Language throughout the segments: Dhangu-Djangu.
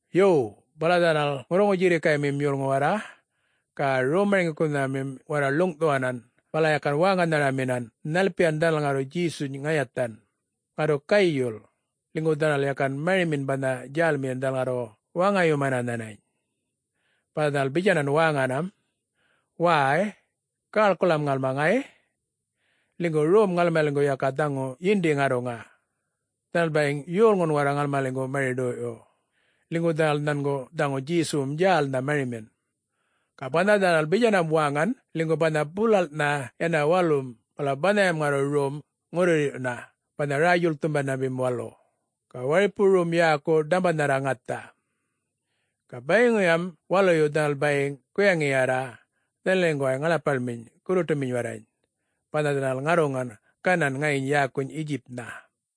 Yo, bala dhanal ŋurruŋu-djirrikaymim yolŋu warra ga rom-marŋgikunhamim warra ḻuŋꞌthuwanan, bala yakan wäŋanharaminan nhalpiyan dhanal ŋarru Djesuny ŋayathan, ŋarru gayul, ḻinygu dhanal yakan marimin banha djälmiyin dhanal ŋarru waŋayumana nhanany. Bala dhanal bitjanan wäŋanam, “Wäy, gäḻkulam ŋalma ŋay, ḻinygu rom ŋalmaliŋgu yaka dhaŋu yindi ŋarruŋa. Dhanal bayiŋ yolŋun warra ŋalmaliŋgu mari-ḏoyꞌyu, ḻinygu dhanal nhangu dhaŋu Djesuwum djälnha marimin.” Ga banha dhanal bitjanam wäŋan ḻinygu banha bulalꞌnha yana walum bala banhayam ŋarru rom ŋurruyirrꞌyuna banha Räy-djuḻkthumandamim Walu, ga waripu rom yäku Ḏambanharra Ŋatha. Ga bayiŋuyam waluyu dhanal bayiŋ guyaŋiyarra dhanaliŋguway ŋaḻapaḻminy, gurruṯuminy warrany, banha dhanal ŋarruŋan, ganan ŋayiny yäkuny Yetjipnha.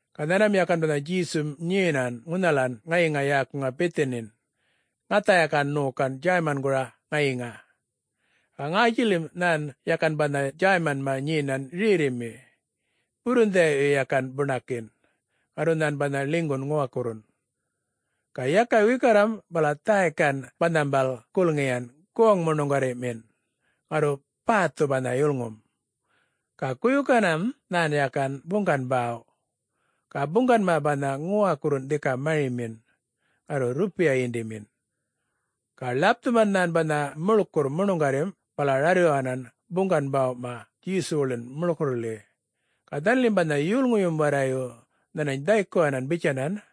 Ga nhanman yakan banha Djesum nyenan ŋunhalan ŋayiŋa yäkuŋa Bithanin, ŋatha yakan ṉokan Djäymangura ŋayiŋa. Ga ŋätjilim nhan yakan banha Djäymanma nyenan rerrimi, burrundhiyaꞌyu yakan buṉakin. Ŋarru nhan banha ḻinygun ŋuwakurrun. Ga yaka wikarram bala dhäykan banhambal gulŋiyan goŋ-muṉuŋgarriꞌmin, ŋarru bäthu banha yulŋum. Ga guyukanan nhan yakan buŋgan-bäw, ga buŋganma banha ŋuwakurrun dhika marimin, ŋarru rrupiya yindimin. Ga ḻapthuman nhan banha muḻkurr muṉuŋgarrim, bala rarryuwanan buŋgan-bäwꞌma Djesuwuḻin muḻkurrḻi. Ga dhanalim banha yolŋuyum warrayu nhanany dhaykuwanan bitjanan,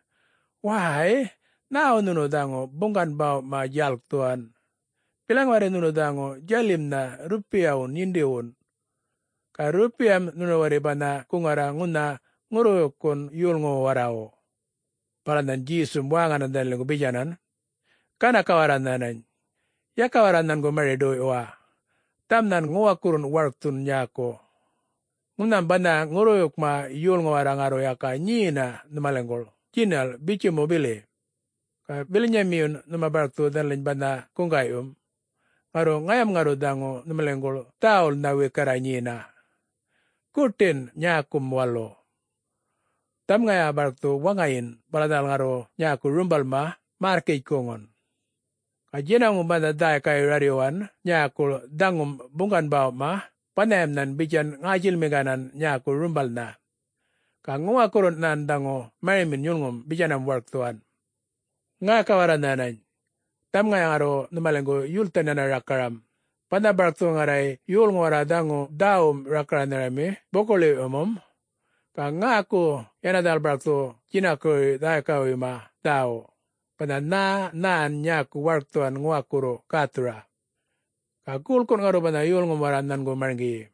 “Wäy! Nhäwu nhunu dhaŋu buŋgan-bäwꞌma djalkthuwan? Bilaŋ warri nhunu dhaŋu djalimnha rrupiyawun yindiwun, ga rrupiyam nhunu warri banha guŋarra ŋunha ŋurruwuykkun yolŋuwu warrawu.” Bala nhan Djesum wäŋanan dhanaliŋgu bitjanan, “Ganaka warra nhanany. Yaka warra nhangu mari-ḏoyꞌyuwa. Dhaŋum nhan ŋuwakurrun warkthuwan nyäku. Ŋunham banha ŋurruwuykma yolŋu warra ŋarru yaka nyena nhumaliŋguḻ djinal bitju bili, ga bilanyamiyun nhuma barkthu dhanaliny banha guŋgaꞌyum. Ŋarru ŋayam ŋarru dhaŋu nhumaliŋguḻ dhäwulnha wikarra nyena, guṯin nyäkum walu. Dhaŋum ŋaya barkthu waŋayin bala dhanal ŋarru nyäku rumbalma märrkitjkuŋun. Ga djinaŋum banha dhäykayu rarryuwan nyäkuḻ dhaŋum buŋgan-bäwꞌma, banhayam nhan bitjan ŋätjilmiŋganan nyäku rumbalnha. Ga ŋuwakurrun nhan dhaŋu marimin yulŋum bitjanam warkthuwan. Ŋäka warra nhänany. Dhaŋum ŋaya ŋarru nhumaliŋgu yulthan yana rakaram. Banha barkthu ŋarruŋay yolŋum warra dhaŋu dhäwum rakaranhami buku-ḻiwꞌyumum, ga ŋäku yana dhanal barkthu djinakuruy dhäykawuyma dhäwu, banha nhä nhan nyäku warkthuwan ŋuwakurru gäthura. Ga guḻkun ŋarru banha yolŋum warra nhangu marŋgiyi.”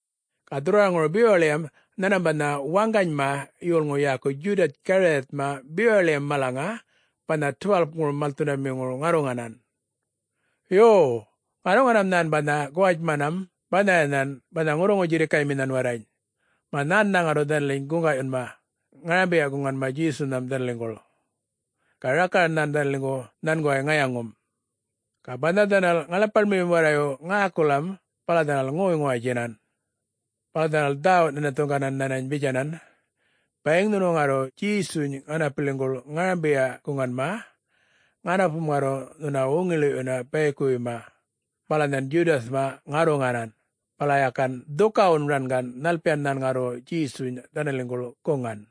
Ga dhurrwaraŋuru bewaḻiyam nhanmam banha waŋganyma yolŋu yäku Djudatj-Gariyatma bewaḻiyam malaŋa banha 12-kurum malthundamiŋuru ŋarruŋanan. Yo, ŋarruŋanam nhan banha guwatjmanam banhayanhan banha ŋurruŋu-djirrikayminhan warrany, mä nhännha ŋarru dhanaliny guŋgaꞌyunma ŋarambiya-guŋanma Djesunham dhanaliŋguḻ. Ga rakaran nhan dhanaliŋguḻ nhanguway ŋayaŋum. Ga banha dhanal ŋaḻapaḻmiyum warra ŋäkulam bala dhanal ŋoy-ŋuwatjinan. Bala dhanal dhawuꞌ-nhinathuŋganan nhanany bitjanan, “Bayiŋ nhunu ŋarru Djesuny ŋanapiliŋguḻ ŋarambiyaꞌ-guŋanma, ŋanapum ŋarru nhuna wuŋiḻiꞌyuna bayikuwuyma.” Bala nhan Djudatjma ŋarruŋanan, bala yakan dhukawun rangan nhalpiyan nhan ŋarru Djesuny dhanaliŋguḻ guŋan.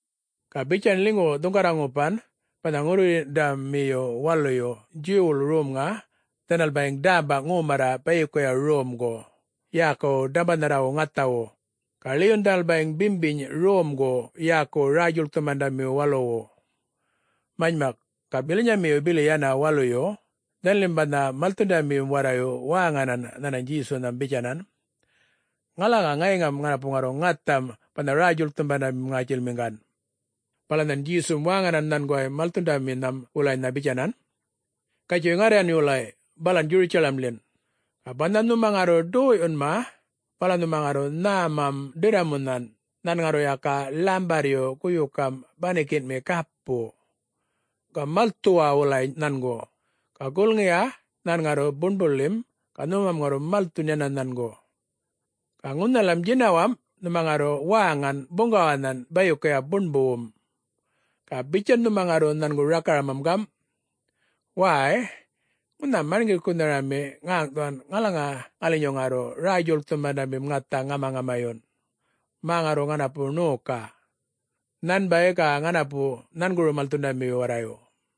Ga bitjan ḻinygu dhuŋgarra ŋupan banha ŋurruyirrꞌyundamiyu waluyu Djuwwuḻ romŋa, dhanal bayiŋ dämba ŋomarra bayikuya romgu yäkuwu Ḏambanharrawu Ŋathawu, ga ḻiyun dhanal bayiŋ bimbiny romgu yäkuwu Räy-djuḻkthumandamiwu Waluwu. Manymak, ga bilanyayu bili yana waluyu, dhanalim banha malthundamiyum warrayu wäŋanan nhanany Djesunham bitjanan, “Ŋalaŋa ŋayiŋam ŋanapu ŋarru ŋatham banha Räy-djulkthumandamim ŋätjilmiŋgan?” Bala nhan Djesum wäŋanan nhanguway malthundaminham wulanynha bitjanan, “Gatjuy ŋarryan wulay balan Djurutjalamḻin. Ga banha nhuma ŋarru ḏoyꞌyunma bala nhuma ŋarru nhämam ḏirramunhan nhan ŋarru yaka ḻambarryu guyukam banikinꞌmi gapu. Ga malthuwa wulay nhangu, ga gulŋiya nhan ŋarru buṉbuḻim, ga nhumam ŋarru malthun yana nhangu. Ga ŋunhalam djinawamꞌ nhuma ŋarru wäŋan buŋgawanhan bayikuya buṉbuwum, ga bitjan nhuma ŋarru nhangu rakaramam gamꞌ, ‘Wäy, ŋunha Marŋgikunharami ŋäŋꞌthuwan ŋalaŋa ŋalinyu ŋarru Räy-djuḻkthumandamim ŋatha ŋamaŋamayun, mä ŋarru ŋanapu ṉoka, nhanbay ga ŋanapu nhanguru malthundamiyu warrayu.’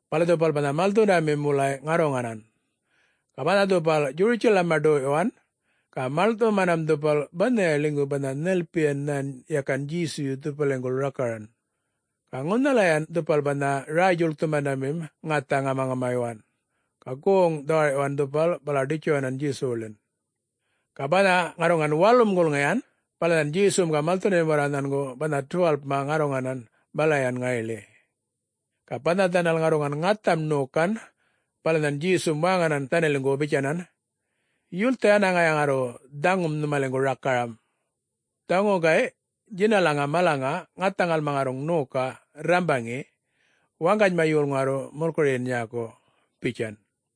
Bala dhupal banha malthundamim wulay ŋarruŋanan. Ga banha dhupal Djurutjalamma ḏoyꞌyuwan, ga maḻŋꞌthumanam dhupal banhaya ḻinygu banha nhalpiyan nhan yakan Djesuyu dhupaliŋguḻ rakaran. Ga ŋunhalayan dhupal banha Räy-djulkthumandamim ŋatha ŋamaŋamayuwan. Ga goŋ-dhawarꞌyuwan dhupal, bala ḏitjuwanan Djesuwuḻin. Ga banha ŋarruŋan walum gulŋiyan, bala nhan Djesum ga malthundamim warra nhangu banha 12-ma ŋarruŋanan balayan ŋayiḻi. Ga banha dhanal ŋarruŋan ŋatham ṉokan, bala nhan Djesum wäŋanan dhanaliŋgu bitjanan, “Yultha yana ŋaya ŋarru dhaŋum nhumaliŋgu rakaram. Dhaŋu gayꞌ djinalaŋa malaŋa ŋatha ŋalma ŋarruŋ ṉoka rrambaŋi, waŋganyma yolŋu ŋarru mulkuruyin nyäku,” bitjan.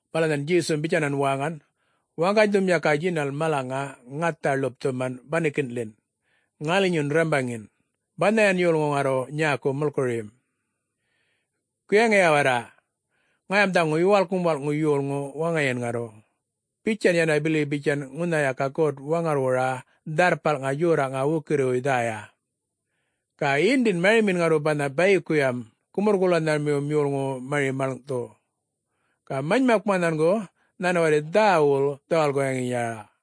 Bala nhan Djesum bitjanan wäŋan, “Waŋganydhum yaka djinal malaŋa ŋathan ḻupthuman banikinꞌḻin, ŋalinyun rrambaŋin, banhayan yolŋu ŋarru nyäku mulkuruyim. Guyaŋiya warra, ŋayam dhaŋu Yuwalkŋum Walꞌŋu Yolŋu waŋayin ŋarru, bitjan yana bili bitjan ŋunha yaka God-Waŋarrwura Dharrpalŋa Djorraꞌŋa wukirriwuy dhäya. Ga yindin marimin ŋarru banha bayikuyam gumurr-golanharamiwum yolŋuwu mari maḻŋꞌthu. Ga manymakma nhangu nhan warri dhäwul dhawal-wuyaŋiyarra.”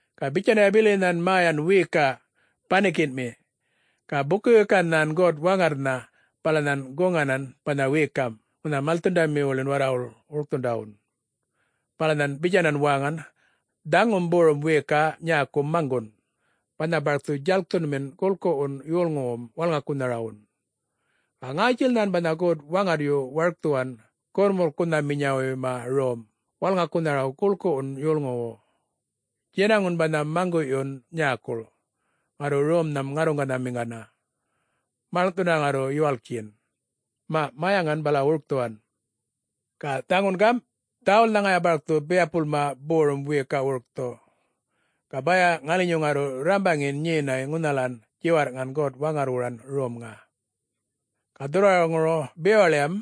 Ga bitjanya bili nhan mäyan wiyikaꞌ banikinꞌmi ga buku-wikan nhan God-Waŋarrnha, bala nhan guŋanan banha wiyikamꞌ ŋunha malthundamiwuḻin warrawuḻ wurkthundawun. Bala nhan bitjanan wäŋan, “Dhaŋum borum wiyikaꞌ nyäku maŋgunꞌ, banha barkthu djalkthunmin guḻkuwun yolŋuwum wälŋakunharawun. Ga ŋätjil nhan banha God-Waŋarryu warkthuwan gumurrkunhaminyawuyma rom wälŋakunharawu guḻkuwum yolŋuwu. Djinaŋun banha maŋguꞌyun nyäkuḻ ŋarru romnham ŋarruŋanhamiŋgana, maḻŋꞌthuna ŋarru yuwalktjin. Maꞌ, mäyaŋan bala wurkthuwan. Ga dhaŋun gamꞌ, dhäwulnha ŋaya barkthu biyapulma borum wiyikaꞌ wurkthu, ga baya ŋalinyu ŋarru rrambaŋin nyenay ŋunhalan djiwarrꞌŋan God-Waŋarrwuran romŋa.” Ga dhurrwaraŋuru bewaḻiyam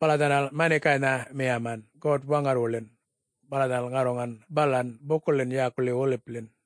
bala dhanal manikaynha miyaman God-Waŋarrwuḻin. Bala dhanal ŋarruŋanan balan bukuḻin yäkuḻi Wolipḻin.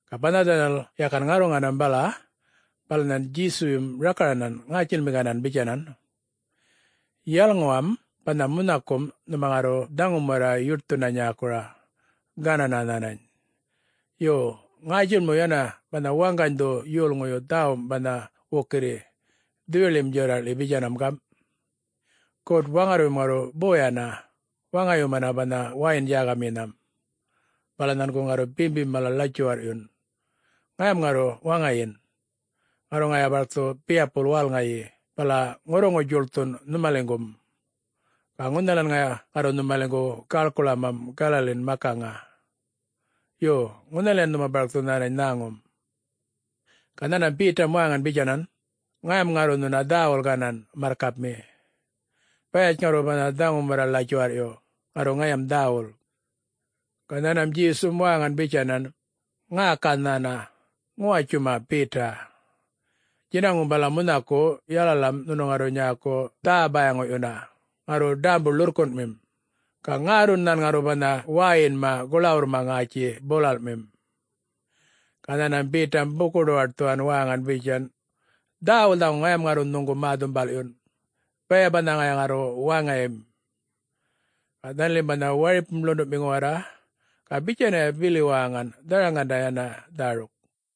Ga banha dhanal yakan ŋarruŋanam bala, bala nhan Djesuyum rakaranan ŋätjilmiŋganan bitjanan, “Yalŋuwam banha munhakum nhuma ŋarru dhaŋum warra yuṯthuna nyäkura, ganana nhänany. Yo, ŋätjil mu yana banha waŋganydhu yolŋuyu dhäwum banha wukirri Dhuyuḻim Djorraꞌḻi bitjanam gamꞌ, ‘God-Waŋarryum ŋarru boyana waŋgayumana banha wäyin-djägaminham, bala nhangu ŋarru bimbim mala ḻatjuwarrꞌyun.’ Ŋayam ŋarru waŋayin. Ŋarru ŋaya barkthu biyapul wälŋayi bala ŋurruŋu-djuḻkthun nhumaliŋgum, ga ŋunhalan ŋaya ŋarru nhumaliŋgu gäḻkuḻamam Galaliŋan makaŋa. Yo, ŋunhalayan nhuma barkthu nhänany nhäŋum.’ Ga nhanmam Betam wäŋan bitjanan, “Ŋayam ŋarru nhuna dhäwul ganan, marrkapmi. Bayatj ŋarru banha dhaŋum warra ḻatjuwarrꞌyu, ŋarru ŋayam dhäwul.” Ga nhanmam Djesum wäŋan bitjanan, “Ŋäka nhäna ŋuwatjuma Beta. Djinaŋum bala munhaku, yalalam nhunu ŋarru nyäku dhä-bayaŋuꞌyuna ŋarru ḏämbu-ḻurrkunꞌmin, ga ŋärrun nhan ŋarru banha wäyinma guḻawurrma ŋätji bulalꞌmim.” Ga nhanmam Betam buku-ḏuwatthuwan wäŋan bitjan, “Dhäwul dhaŋu ŋayam ŋarru nhuŋu mä-dhumbalꞌyun, baya banha ŋaya ŋarru waŋayim!” Ga dhanalim banha waripum ḻunduꞌmiŋu warra ga bitjanaya bili wäŋan dharaŋanda yana dhäruk.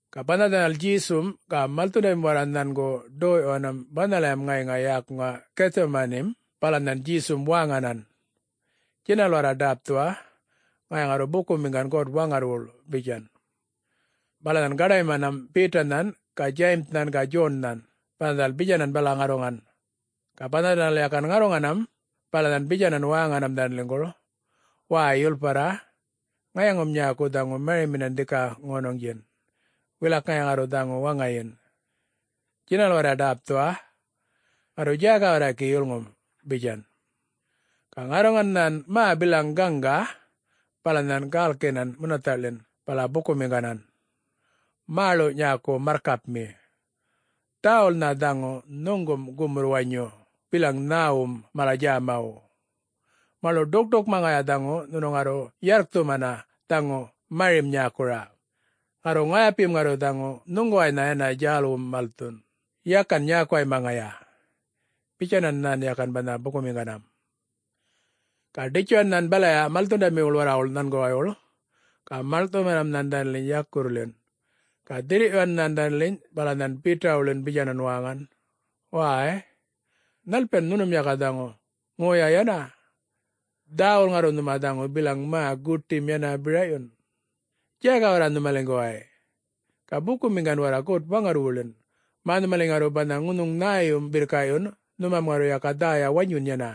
Ga banha dhanal Djesum ga malthundamim warra nhangu ḏoyꞌyuwanam banhalayam ŋayiŋa yäkuŋa Githtjamanim, bala nhan Djesum wäŋanan, “Djinal warra ḏäpthuwa, ŋaya ŋarru bukumiŋgan God-Waŋarrwuḻ,” bitjan. Bala nhan gaḏaymanam Betanhan ga Djayimnhan ga Djonnhan, bala dhanal bitjanan bala ŋarruŋan. Ga banha dhanal yakan ŋarruŋanam, bala nhan bitjanan wäŋanam dhanaliŋguḻ, “Wäy, yulparra, ŋayaŋum nyäku dhaŋu mariminan dhika ŋonuŋdjin, wilak ŋaya ŋarru dhaŋu waŋayin. Djinal warra ḏäpthuwa, ŋarru djäga warra gi yulŋum,” bitjan. Ga ŋarruŋan nhan mä bilaŋ gaŋga, bala nhan gälkinan munathaꞌḻin bala bukumiŋganan, “Mäḻu nyäku marrkapmi, dhäwulnha dhaŋu nhuŋgum gumurr-wanyu bilaŋ nhäwum mala djämawu. Mäḻuꞌ, ḏukṯukma ŋaya dhaŋu nhunu ŋarru yarrkthumana dhaŋu marim nyäkura. Ŋarru ŋayapim ŋarru dhaŋu nhuŋguwaynha yana djälwum malthun, yakan nyäkuwayma ŋaya,” bitjanan nhan yakan banha bukumiŋganam. Ga ḏitjuwan nhan balaya malthundamiwuḻ warrawuḻ nhanguwaywuḻ, ga maḻŋꞌthumanam nhan dhanaliny yakurrḻin. Ga dhirrꞌyuwan nhan dhanaliny, bala nhan Betawuḻin bitjanan wäŋan, “Wäy, nhalpiyan nhunum yaka dhaŋu, ŋoya yana? Dhäwul ŋarru nhuma dhaŋu bilaŋ mä guṯim yana biraꞌyun? Djäga warra nhumaliŋguway, ga bukumiŋgan warra God-Waŋarrwuḻin, mä nhumaliny ŋarru banha ŋunhuŋ nhäyum birrkaꞌyun, nhumam ŋarru yaka dhäya wanyun yana.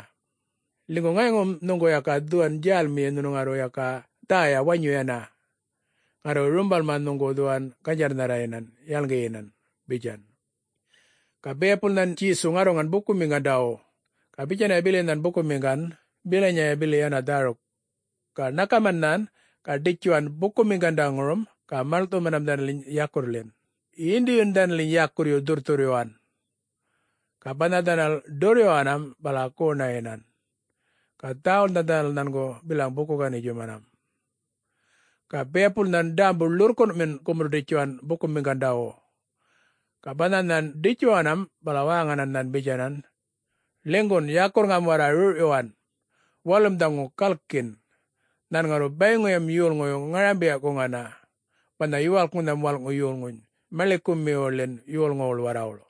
Ḻinygu ŋayaŋum nhuŋgu yaka dhuwan djälmiyi nhunu ŋarru yaka dhäya wanyu yana, ŋarru rumbalma nhuŋgu dhuwan ganydjarrnharrayinan yalŋgiyinan,” bitjan. Ga biyapul nhan Djesu ŋarruŋan bukumiŋgandawu, ga bitjanaya bili nhan bukumiŋgan bilanyaya bili yana dhäruk. Ga ṉakaman nhan, ga ḏitjuwan bukumiŋgandaŋurum ga maḻŋꞌthumanam dhanaliny yakurrḻin, yindiyu dhanaliny yakurryu dhurrthurryuwan. Ga banha dhanal ḏurryuwanam bala goṉayinan, ga dhäwulnha dhanal nhangu bilaŋ buku-ganitjumanam. Ga biyapul nhan ḏämbu ḻurrkunꞌmin gumurr-ḏitjuwan bukumiŋgandawu. Ga banha nhan ḏitjuwanam bala wäŋanan nhan bitjanan, “Ḻinygun, yakurrŋam warra rrurꞌyuwan! Walum dhaŋu galkin, nhan ŋarru bayiŋuyam yolŋuyu ŋarambiya-guŋana banha Yuwalkŋunham Walꞌŋu Yolŋuny maḻikumiwuḻin yolŋuwuḻ warrawuḻ.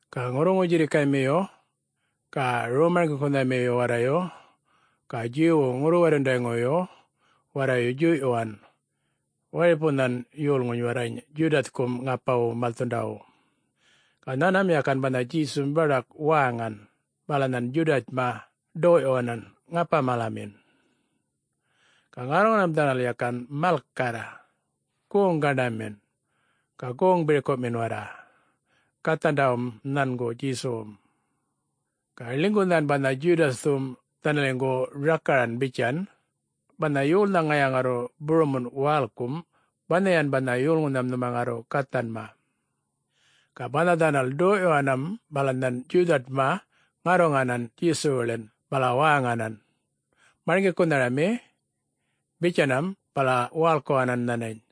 Ga ŋurruŋu-djirrikaymiyu ga rom-marŋgikunhamiyu warrayu ga Djuwwu ŋurru-warrundayŋuyu warrayu djuyꞌyuwan waripunhan yolŋuny warrany Djudatjkum ŋapawu malthundawu. Ga nhanmam yakan banha Djesum baḏak wäŋan, bala nhan Djudatjma ḏoyꞌyuwanan ŋapa-malamin. Ga ŋarruŋanam dhanal yakan malkarr, goŋ gaṉamin, ga goŋ birkuꞌmin warra, gathandawun nhangu Djesuwun. Ga ḻinygu nhan banha Djudatjthum dhanaliŋgu rakaran bitjan, “Banha yolnha ŋaya ŋarru burumunꞌ wälkum banhayan banha yolŋunham nhuma ŋarru gathanma.” Ga banha dhanal ḏoyꞌyuwanam bala nhan Djudatjma ŋarruŋanan Djesuwuḻin bala wäŋanan, “Marŋgikunharami,” bitjanam bala wälkuwanan nhanany,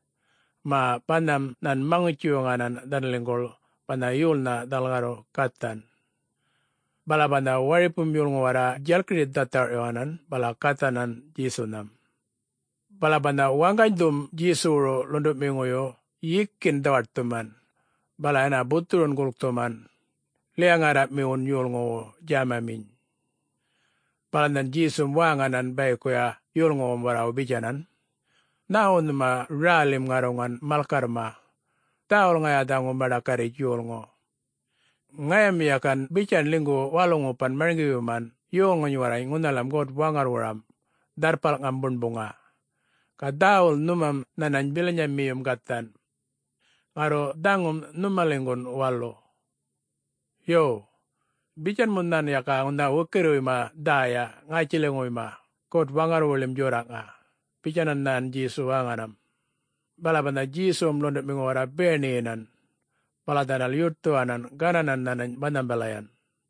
mä banham nhan maŋutji-wuŋanan dhanaliŋguḻ banha yolnha dhanal ŋarru gathan. Bala banha waripum yolŋu warra djalkiri-dhatharꞌyuwanan bala gathanan Djesunham. Bala banha waŋganydhum Djesuwuru ḻunduꞌmiŋuyu yikin dhawaṯthuman bala yana buthurun gulkthuman, liya-ŋärraꞌmiwun yolŋuwu djämaminy. Bala nhan Djesum wäŋanan bayikuya yolŋuwum warrawu bitjanan, “Nhäwu nhuma rälim ŋarruŋan malkarrma? Dhäwul ŋaya dhaŋu maḏakarritj yolŋu. Ŋayam yakan bitjan ḻinygu walu-ŋupan marŋgiyuman yolŋuny warrany ŋunhalam God-Waŋarrwuram Dharrpalŋam Buṉbuŋa, ga dhäwul nhumam nhänany bilanyamiyum gathan,... ŋarru dhaŋum nhumaliŋgun walu. Yo, bitjan mu nhan yaka ŋunha wukirriwuyma dhäya ŋätjiliŋuwuyma God-Waŋarrwuḻim Djorraꞌŋa,” bitjanan nhan Djesu wäŋanam. Bala banha Djesuwum ḻunduꞌmiŋu warra biyaṉiyinan bala dhanal yuṯthuwanan, gananan nhanany banhambalayan.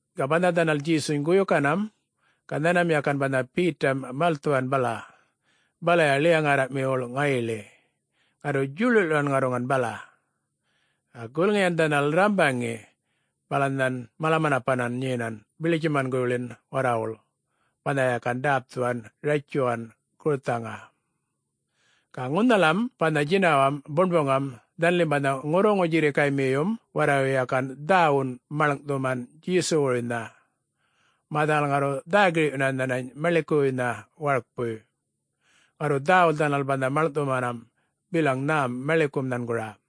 Ga banha dhanal Djesuny guyukanam, ga nhanmam yakan banha Betam malthuwan bala, balaya ḻiya-ŋärraꞌmiwuḻ ŋayiḻi, ŋarru djuḻuḻꞌyuwan ŋarruŋan bala. Ga gulŋiyan dhanal rrambaŋi, bala nhan mala-manapanan nyenan biḻitjumanguḻin warrawuḻ banha yakan ḏäpthuwan ratjuwan gurthaŋa. Ga ŋunhalam banha djinawamꞌ buṉbuŋam dhanalim banha ŋurruŋu-djirrikaymiyum warrayu yakan dhäwunꞌ maḻŋꞌthuman Djesuwuruynha, mä dhanal ŋarru dhä-girꞌyuna nhanany maḻikuwuynha warkpuy. Ŋarru dhäwul dhanal banha maḻŋꞌthumanam bilaŋ nhäm maḻikum nhangura.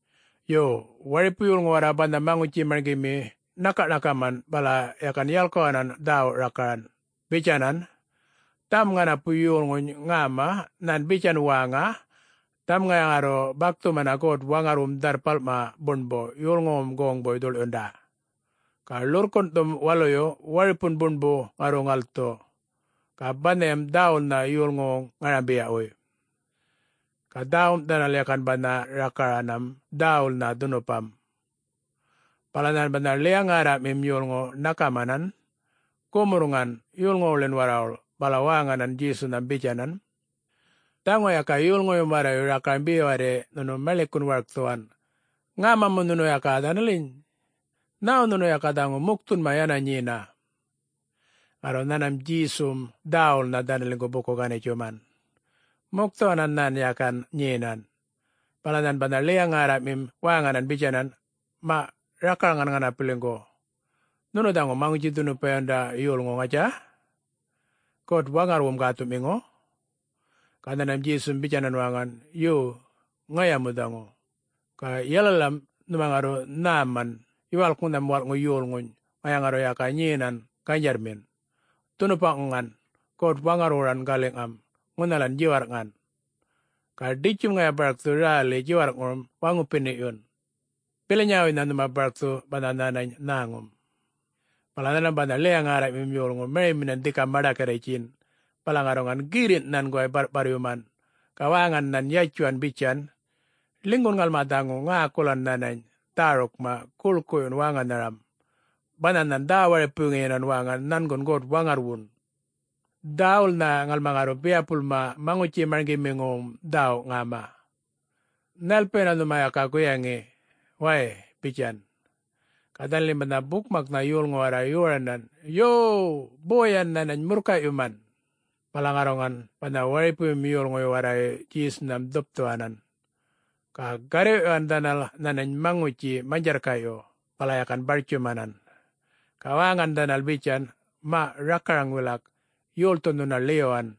Yo, waripu yolŋu warra banha maŋutji-marŋgimi ṉakaꞌṉakaman bala yakan yalkuwanan dhäwu rakaran bitjanan, “Dhaŋum ŋanapu yolŋuny ŋäma nhan bitjan wäŋa, ‘Dhaŋum ŋaya ŋarru bakthumana God-Waŋarrwum Dharrpalma Buṉbu yolŋuwuŋum goŋbuy dhuḻꞌyunda. Ga ḻurrkunꞌthum waluyu waripun buṉbu ŋarru ŋalthu, ga banhayam dhäwulnha yolŋuwuŋ ŋarambiyawuy.’” Ga dhäwum dhanal yakan banha rakaranam dhäwulnha dhunupam. Bala nhan banha ḻiya-ŋärraꞌmim yolŋu ṉakamanan gumurrŋan yolŋuwuḻin warrawuḻ bala wäŋanan Djesunham bitjanan, “Dhaŋu yaka yolŋuyum warrayu rakaram be warri nhunu maḻikun warkthuwan. Ŋäma mu nhunu yaka dhanaliny? Nhäwu nhunu yaka dhaŋu mukthunma yana nyena?” Ŋarru nhanmam Djesum dhäwulnha dhanaliŋgu buku-ganitjuman. Mukthuwanan nhan yakan nyenan. Bala nhan banha ḻiya-ŋärraꞌmim wäŋanan bitjanan, “Maꞌ, rakaraŋan ŋanapiliŋgu. Nhunu dhaŋu Maŋutji-dhunupayumandam yolŋu, ŋatja?.... God-Waŋarrwum gäthuꞌmiŋu?’ Ga nhanmam Djesum bitjanan wäŋan, “Yo, ŋaya mu dhaŋu. Ga yalalam nhuma ŋarru nhäman Yuwalkŋunham Walꞌŋu Yolŋuny, ŋaya ŋarru yaka nyenam ganydjarrmin, dhunupaꞌŋuŋan God-Waŋarrwuran galiꞌŋam ŋunhalan djiwarrꞌŋan. Ga ḏitjum ŋaya barkthu räli djiwarrꞌŋurum waŋupiniyun. Bilanyawuynha nhuma barkthu banha nhänany nhäŋum.” Bala nhanmam banha ḻiya-ŋärraꞌmim yolŋu mariminan dhika maḏakarritjin, bala ŋarruŋan girrinꞌ nhanguway barrꞌparryuman, ga wäŋan nhan yatjuwan bitjan, “Ḻinygun ŋalma dhaŋu ŋäkulan nhanany dhärukma guḻkuyun wäŋanharam, banha nhan dhä-waripuŋuyinan wäŋan nhangun God-Waŋarrwun. Dhäwulnha ŋalma ŋarru biyapulma maŋutji-marŋgimiwuŋum dhäwu ŋäma. Nhalpiyana nhumam yaka guyaŋi, way?” bitjan. Ga dhanalim banha bukmakma yolŋum warra yoranan, “Yo, boyan nhanany murrkayꞌyuman.” Bala ŋarruŋan banha waripuyum yolŋuyu warrayu Djesunham dhupthuwanan. Ga garrwiꞌyuwan dhanal nhanany maŋutji manydjarrkaꞌyu bala yakan bartjumanan, ga wäŋan dhanal bitjan, “Maꞌ rakaraŋ wilak, yolthu nhuna ḻiyuwan?”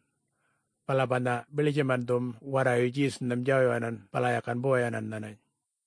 Bala banha biḻitjumandhum warrayu Djesunham djawyuwanan bala yakan boyanan nhanany.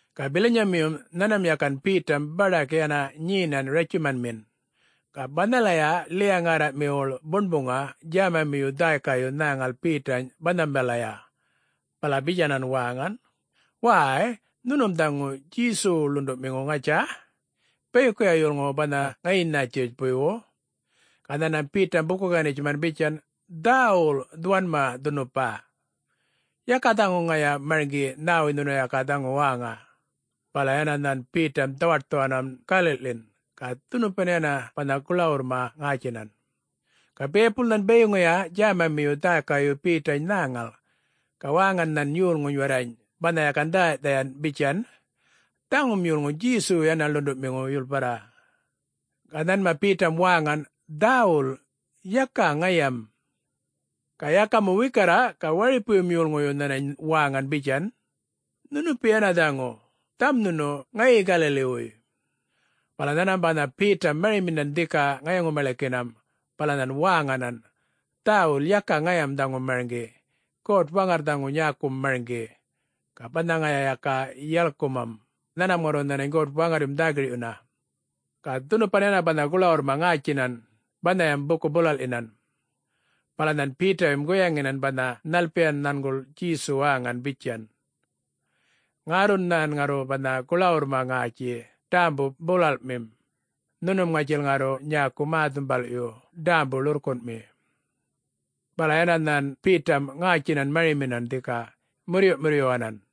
Ga bilanyamiyum nhanmam yakan Betam baḏak yana nyenan ratjumanmin. Ga banhalaya ḻiya-ŋärraꞌmiwuḻ buṉbuŋa djämamiyu dhäykayu nhäŋal Betany banhambalaya, bala bitjanan waŋan, “Wäy, nhunum dhaŋu Djesuwu ḻunduꞌmiŋu, ŋatja?... bayikuya yolŋuwu banha ŋayi Nätjiritjpuywu?” Ga nhanmam Betam buku-ganitjuman bitjan, “Dhäwul dhuwanma dhunupa. Yaka dhaŋu ŋaya marŋgi nhäwuy nhunu yaka dhaŋu wäŋa.” Bala yana nhan Betam dhawaṯthuwanan galiꞌḻin [ga dhunupan yana banha guḻawurrma ŋätjinan]. Ga biyapul nhan bayiŋuya djämamiyu dhäykayu Betany nhäŋal, ga wäŋan nhan yolŋuny warrany banha yakan dhäyaꞌ-dhayan bitjan, “Dhaŋum yolŋu Djesuwu yana ḻunduꞌmiŋu yulparra.” Ga nhanma Betam wäŋan, “Dhäwul!... yaka ŋayam!” Ga yaka mu wikarra ga waripuyum yolŋuyu nhanany wäŋan bitjan, “Nhunupi yana dhaŋu, dhaŋum nhunu ŋayi Galaliwuy.” Bala nhanmam banha Betam mariminan dhika ŋayaŋu-maḻikinam bala nhan wäŋanan, “Dhäwul, yaka ŋayam dhaŋu marŋgi. God-Waŋarr dhaŋu nyäkum marŋgi, ga banha ŋaya yaka yalkumam, nhanmam ŋarru nhänany God-Waŋarryum dhä-girꞌyuna.” Ga dhunupan yana banha guḻawurrma ŋätjinan, banhayam buku-bulalꞌyinan. Bala nhan Betayum guyaŋinan banha nhalpiyan nhanguḻ Djesu wäŋan bitjan, “Ŋärrun nhan ŋarru banha guḻawurrma ŋätji ḏämbu-bulalꞌmim, nhunum ŋatjil ŋarru nyäku mä-dhumbalꞌyu ḏämbu-ḻurrkunꞌmi.” Bala yana nhan Betam ŋätjinan mariminan dhika murruyꞌ-murruyyuwanan.